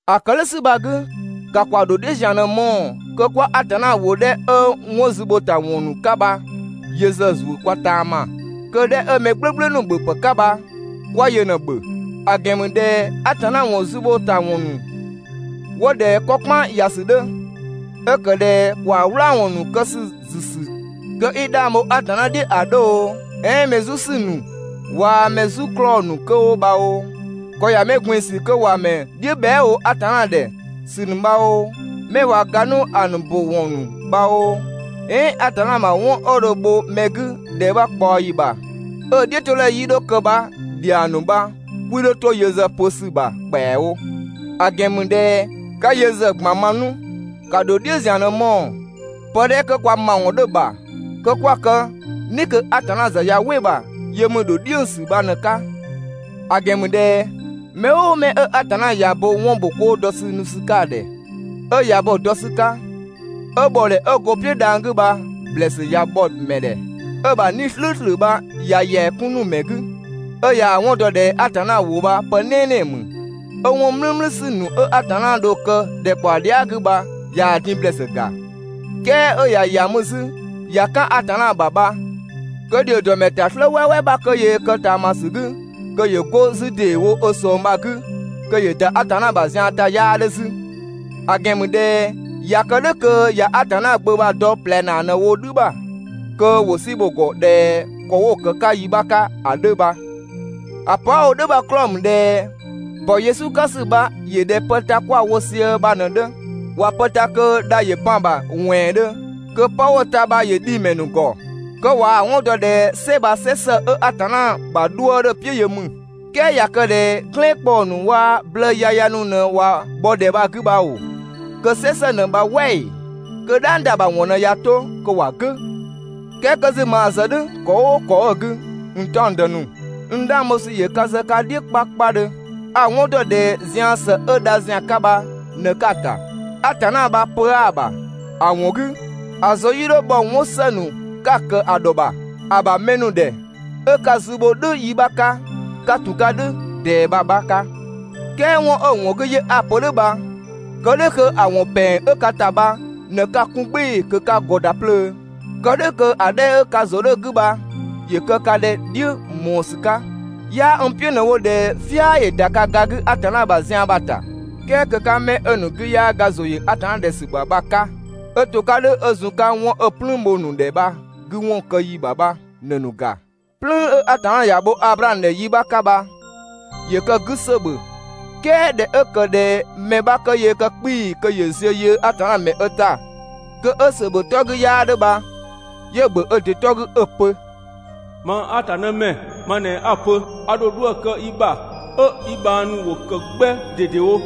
‑A ‑kë "dhʋ̈ ‑sü bha‑ 'gü, ‑ka ‑kwa ‑dho "dhiʋ̈ ‑zian ꞊në‑ mɔɔ‑ kö 'kwa Atanna ‑wʋ 'dhɛ 'ö 'wɔn zü ‑bho ‑ta ‑wɔn ‑nu 'ka bha yö ‑zë ‑zuö kwa ꞊taama, kö‑ 'dhɛ 'ö mɛ "gblʋ̈gblʋ̈ ‑nu ‑bhöpë 'ka bha 'kwa yö ꞊në‑ ‑bhö. ‑A ‑gɛn ‑mü ꞊dhɛ Atanna ‑wɔn zü ‑bho ‑ta ‑wɔn ‑nu 'wo ꞊dhɛ ‑kɔ "kpan ‑ya ‑sü 'dhö, 'ö ‑kë ꞊dhɛ ‑kwaa "wlaawɔn ‑nu kë ‑sü ‑zü ‑sü kö 'i 'dhang bho Atanna "dhiʋ̈ ‑a 'dhö oo, "ɛɛn mɛ "zu ‑sü ‑nu waa‑ mɛ "zu 'klɔɔ‑ ‑nu 'kö 'wo bha oo, ‑kɔ ‑ya mɛ ꞊gbin‑ ‑sü (kö ‑wa ‑mɛ "dhiʋ̈ bhɛa" wo Atanna ‑dhɛ) ‑sü ‑nu bha oo, 'mɛ ꞊wa ga 'nu ‑a ‑nu ‑bö ‑wɔn ‑nu bha oo, "ɛɛn Atanna ‑bha 'wɔn 'ö dho‑ bho mɛ 'gü ‑dhɛ 'bha ꞊kpaɔyi ‑bha 'ö‑ "dhiʋ̈todhɛ 'yii 'dho kë bha‑ ‑dhiang ‑nu bha 'kwii 'dho 'to yö ‑zë pö ‑sü ‑bha ‑kpɛawo. ‑A ‑gɛn ‑mü ꞊dhɛ 'ka yö ‑zë ꞊gban ma 'nu. ‑Ka ‑dho "dhiʋ̈ ‑zian ꞊në‑ mɔɔ‑. Pë 'dhɛ 'kö kwa ‑mawɔn 'dhö‑ ‑bha kö 'kwa‑ kë "ni kö Atanna ‑zë ꞊ya "wɩ‑ ‑bha yö ‑mü ‑dho "dhiʋ̈ ‑sü bha ꞊në‑ 'ka. ‑A ‑gɛn ‑mü ꞊dhɛ mɛ "ʋʋ mɛ 'ö Atanna ꞊ya bo 'wɔn ‑bho 'koo dɔ ‑sü nu ‑sü 'ka‑ ‑dhɛ 'ö ꞊ya bo‑ dɔ ‑sü 'ka, 'ö ‑bhɔdhɛ 'ö go‑ "piʋ̈ dhang‑ 'gü bha‑ ‑blɛɛsü ꞊ya bhɔ‑ ‑mɛ ‑dhɛ, 'ö‑ ‑bha 'Nii‑ "slʋ̈ʋ̈slʋ̈ bha ꞊ya ‑yɛa 'kun 'nu‑ ‑mɛ 'gü, 'ö ꞊yaa‑ 'wɔn dɔ ꞊dhɛ Atanna ‑wʋ bha pë "nɛɛnɛɛ ‑mü, 'ö 'wɔn "mlümlü ‑sü ‑nu 'ö Atanna dho‑ kë ‑dhɛkpaɔ dhia" 'gü bha ꞊yaa‑ din ‑blɛɛsü ‑ga, "kɛɛ 'ö ꞊ya ‑ya mü 'zü ꞊ya "kan Atanna ‑bha bha kö ‑dhio ‑dɔ ‑mɛ ‑ta "slë "wɛɛwɛɛ 'bha kö yöö kë ꞊taamasü 'gü kö ‑yö 'go 'zü ‑deewo ö ꞊sɔng bha‑ 'gü kö ‑yö ‑da Atanna ‑bha zian ‑ta 'yaa 'dhö 'zü. ‑A ‑gɛn ‑mü ꞊dhɛ ꞊ya kë "dhʋ̈ kö ꞊ya Atanna Gbö bha‑ dɔ ꞊plɛ ‑naa ꞊në wo "dhü ‑bha kö ‑wo "si bho‑ ‑gɔ ꞊dhɛ ‑kɔ 'wo‑ ‑kë 'ka yi 'bha 'ka ‑a 'dhö bha. ‑A pö 'a‑ wo "dhʋ̈ bha‑ 'klɔɔ‑ ‑mü ꞊dhɛ ‑bɔ Yesu 'ka ‑sü bha ‑yö ꞊dhɛ pë ta 'kwa‑ wo sië bha ꞊në‑ 'dhö. ꞊Wa pë ta kö dha ‑yö ban‑ ‑bha ‑wɛɛndhö kö 'pë 'wo‑ ta bha ‑yö dhi‑ ‑mɛ ‑nu ‑gɔ, kö ꞊waa‑ 'wɔn dɔ ꞊dhɛ "sɛ bha "sɛ ‑së 'ö Atanna ‑bha 'dhuë‑ 'dhö‑ "piʋ̈ yö ‑mü. "Kɛɛ ꞊ya kë ꞊dhɛ "glɛɛn ‑kpɔɔ ‑nu waa‑ blëë yaya ‑nu ꞊në ꞊wa bhɔ ‑dhɛ bha‑ 'gü bha ‑oo, kö "sɛ ‑së ꞊në bha "wɛ ‑ee? Kö "dhang ‑da ‑bha ‑wɔn ꞊në ꞊ya 'to kö ‑wa "gʋ̈. "Kɛɛ 'kö 'zü maa‑ zë "dhʋ̈ ‑kɔ "ʋʋ ‑kɔ 'ö‑ 'gü, n "taɔngdë ‑nu, n 'dhang bho ‑sü ‑yö ka ‑zë ka "dhiʋ̈ 'kpakpadhö, a‑ 'wɔn ‑dɔ ꞊dhɛ zian ‑së 'ö dha ‑zian 'ka bha ꞊në 'ka‑ ‑ta. Atanna bha pö 'aa‑ ‑bha. ‑A ‑wɔn 'gü, ‑a ‑zʋ 'yii 'dho bhɔ 'wɔn ‑së ‑nu 'ka‑ ‑kë ‑a ‑dhɔ ‑bha, ‑a ‑bha mɛ ‑nu ‑dhɛ, 'ö 'ka‑ zü bho "dhʋ̈ 'yi bha‑ 'ka 'ka ‑tun 'ka "dhʋ̈ ꞊dɛɛ bha‑ 'bha 'ka. "Kɛɛ 'wɔn 'ö‑ ‑wɔn 'gü 'yö 'a‑ pö "dhʋ̈ bha, kë "dhʋ̈ kö ‑a ‑wɔn ‑pɛng 'ö ka ‑ta bha ꞊në 'ka‑ 'kun "gbɩɩ‑ kö 'ka‑ ‑gɔ ‑da 'plöö. Kë "dhʋ̈ kö ‑a 'dhɛ 'ö ka ‑zʋ 'dhö‑ 'gü bha ‑yö kë ka ꞊dhɛ "dhiʋ̈ ꞊mɔɔ ‑sü 'ka. 'Yaa n "piʋ̈ ꞊në‑ wo ꞊dhɛ "fia ‑yö ‑da ka ga 'gü Atanna ‑bha zian bha‑ ‑ta, "kɛɛ kö 'ka 'mɛ 'ö‑ ‑nu 'gü 'yaa ga ‑zʋ ‑yö ‑a ‑dhɛ ‑sü bha‑ 'ka, 'ö to‑ 'ka "dhʋ̈ 'ö zun‑ 'ka 'wɔn 'ö‑ "plüün bho‑ ‑nu ‑dhɛ bha‑ 'gü ‑wɔn kë ‑yi ‑bha bha ꞊në‑ ‑nu ‑ga. "Plüün 'ö Atanna ‑ya bho Ablaamö ‑dhɛ yi 'bha 'ka bha, ‑yö kë‑ 'gü ‑sö ‑bhö, "kɛɛ ꞊dhɛ 'ö ‑kë ꞊dhɛ mɛ 'bha kö yöö kë 'kpii‑ kö ‑yö ziö yöö Atanna ‑mɛ ö ‑ta kö 'ö ‑sö ‑bhö 'tɔ 'gü 'yaa 'dhö bha, 'yö‑ ‑bhö ö ‑dɩ 'tɔ 'gü 'ö‑ pö: «Mang Atanna ‑mɛ ma ꞊në 'a‑ pö, a ‑dho 'dhuë‑ kë i ‑bha, 'ö i bhang ‑nu 'wo ‑kë 'gbɛ ꞊dedewo.»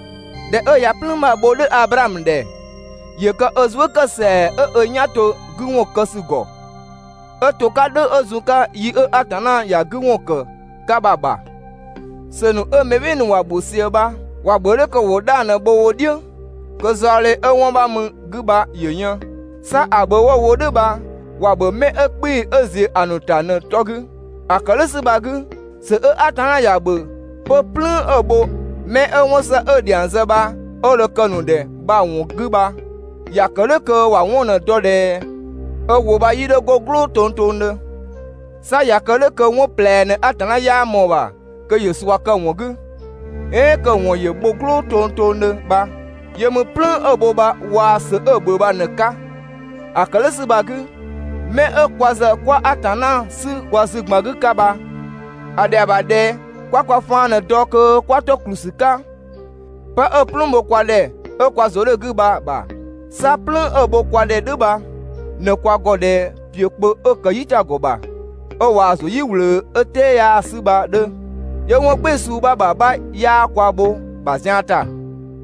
꞊Dhɛ 'ö ꞊ya "plüün bha‑ bho "dhʋ̈ Ablaamö ‑dhɛ, ‑yö kë ö zuë" ‑kë ‑sɛa 'ö ö "yan to‑ 'gü ‑wɔn kë ‑sü ‑gɔ, 'ö to‑ 'ka "dhʋ̈ ö zun‑ 'ka yi 'ö Atanna ‑ya 'gü ‑wɔn ‑kë 'ka bha‑ ‑bha. ‑Sö ‑nu 'ö mɛ "bhɩɩ‑ ‑nu ‑wa ‑bhö ꞊sië bha, ‑wa ‑bhö "dhʋ̈ kö ‑wo 'dhang ꞊në bho wo "dhiʋ̈, kö zaɔdhe 'ö 'wɔn 'bha ö mü‑ 'gü bha ‑yö yën, 'sa ‑a ‑bhö 'wo‑ wo "dhʋ̈ bha, ‑wa ‑bhö 'mɛ 'ö 'kpii‑ 'ö ‑ziö ‑a ‑nu ‑ta ꞊në‑ 'tɔ 'gü. ‑A ‑kë "dhʋ̈ ‑sü bha‑ 'gü, ‑sö 'ö Atanna ‑ya ‑bhö 'pö "plüün 'ö‑ bho 'mɛ 'ö 'wɔn ‑së 'ö‑ ‑dhiang zë bha 'ö dho‑ kë‑ ‑nu ‑dhɛ bha‑ ‑wɔn 'gü bha ‑ya ‑kë "dhʋ̈ kö ‑wa 'wɔn ꞊në‑ dɔ ꞊dhɛ ö ‑wʋ bha 'yii 'dho 'go "gblʋʋ tongtongdhö. 'Sa ꞊ya kë "dhʋ̈ kö 'wɔn ꞊plɛ ꞊në Atanna 'yaa ꞊mɔɔ‑ ‑bha kö ‑yö ꞊sua kë‑ ‑wɔn 'gü, "ɛɛn kö‑ ‑wɔn ‑yö bho "gblʋʋ tongtongdhö bha. Yö ‑mü "plüün 'ö‑ bho bha waa‑ ‑sö 'ö‑ ‑bhö bha ꞊në‑ 'ka. ‑A ‑kë "dhʋ̈ ‑sü bha‑ 'gü, 'mɛ 'ö kwa ‑zë 'kwa Atanna 'sü kwa zü ‑gban 'gü 'ka bha, ‑a ‑dhɛa ‑bha ꞊dhɛ 'kwa kwa faan ꞊në‑ dɔ kö 'kwa 'to ‑kplü ‑sü 'ka 'pë 'ö‑ "plüün bho kwa ‑dhɛ 'ö kwa ‑zʋ 'dhö‑ 'gü bha‑ ‑bha. 'Sa "plüün 'ö‑ bho kwa ‑dhɛ "dhʋ̈ bha ꞊në kwa ‑gɔ ꞊dhɛ ‑piö kpö 'ö ‑kë "yitagɔ ‑bha 'ö ꞊waa‑ ‑zuö "yi ꞊wlöö 'ö "tɛɛ 'yaa‑ 'sü bha‑ 'dhö, 'yö 'wɔn "gbɩɩ‑ suu 'bha ‑bha 'bha 'yaa kwa bho‑ ‑bha zian ‑ta,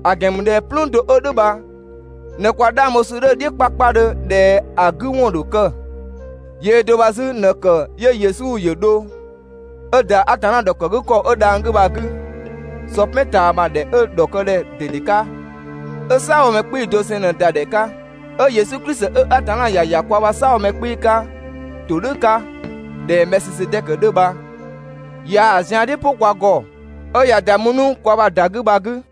‑a ‑gɛn ‑mü ꞊dhɛ "plüün do 'ö "dhʋ̈ bha ꞊në kwa 'dhang bho ‑sü 'dhö‑ "dhiʋ̈ 'kpakpadhö ꞊dhɛ ‑a 'gü ‑wɔn ‑dho kë. Yöö do bha 'zü ꞊në‑ ‑kë 'yö Yesu ‑yö dho 'ö ‑da Atanna ‑dhɔkëgükɔ 'ö dhang‑ 'gü bha‑ 'gü, sɔ "pɛn ꞊taama ‑dhɛ 'ö‑ ‑dhɔkëdhɛ ꞊dede 'ka, 'ö "saabhomɛ 'kpii‑ doseng ꞊në‑ ‑da ‑dhɛ 'ka, 'ö Yesu Klisi 'ö Atanna ‑ya ‑ya kwa ‑bha "saabhomɛ 'kpii‑ 'ka ‑todhʋ̈ 'ka ꞊dhɛ Mɛɛsisedɛkö 'dhö bha ꞊yaa‑ zian "dhi "pʋ kwa ‑gɔ, 'ö ꞊ya ‑da mü 'nu kwa ‑bha ‑da 'gü bha‑ 'gü.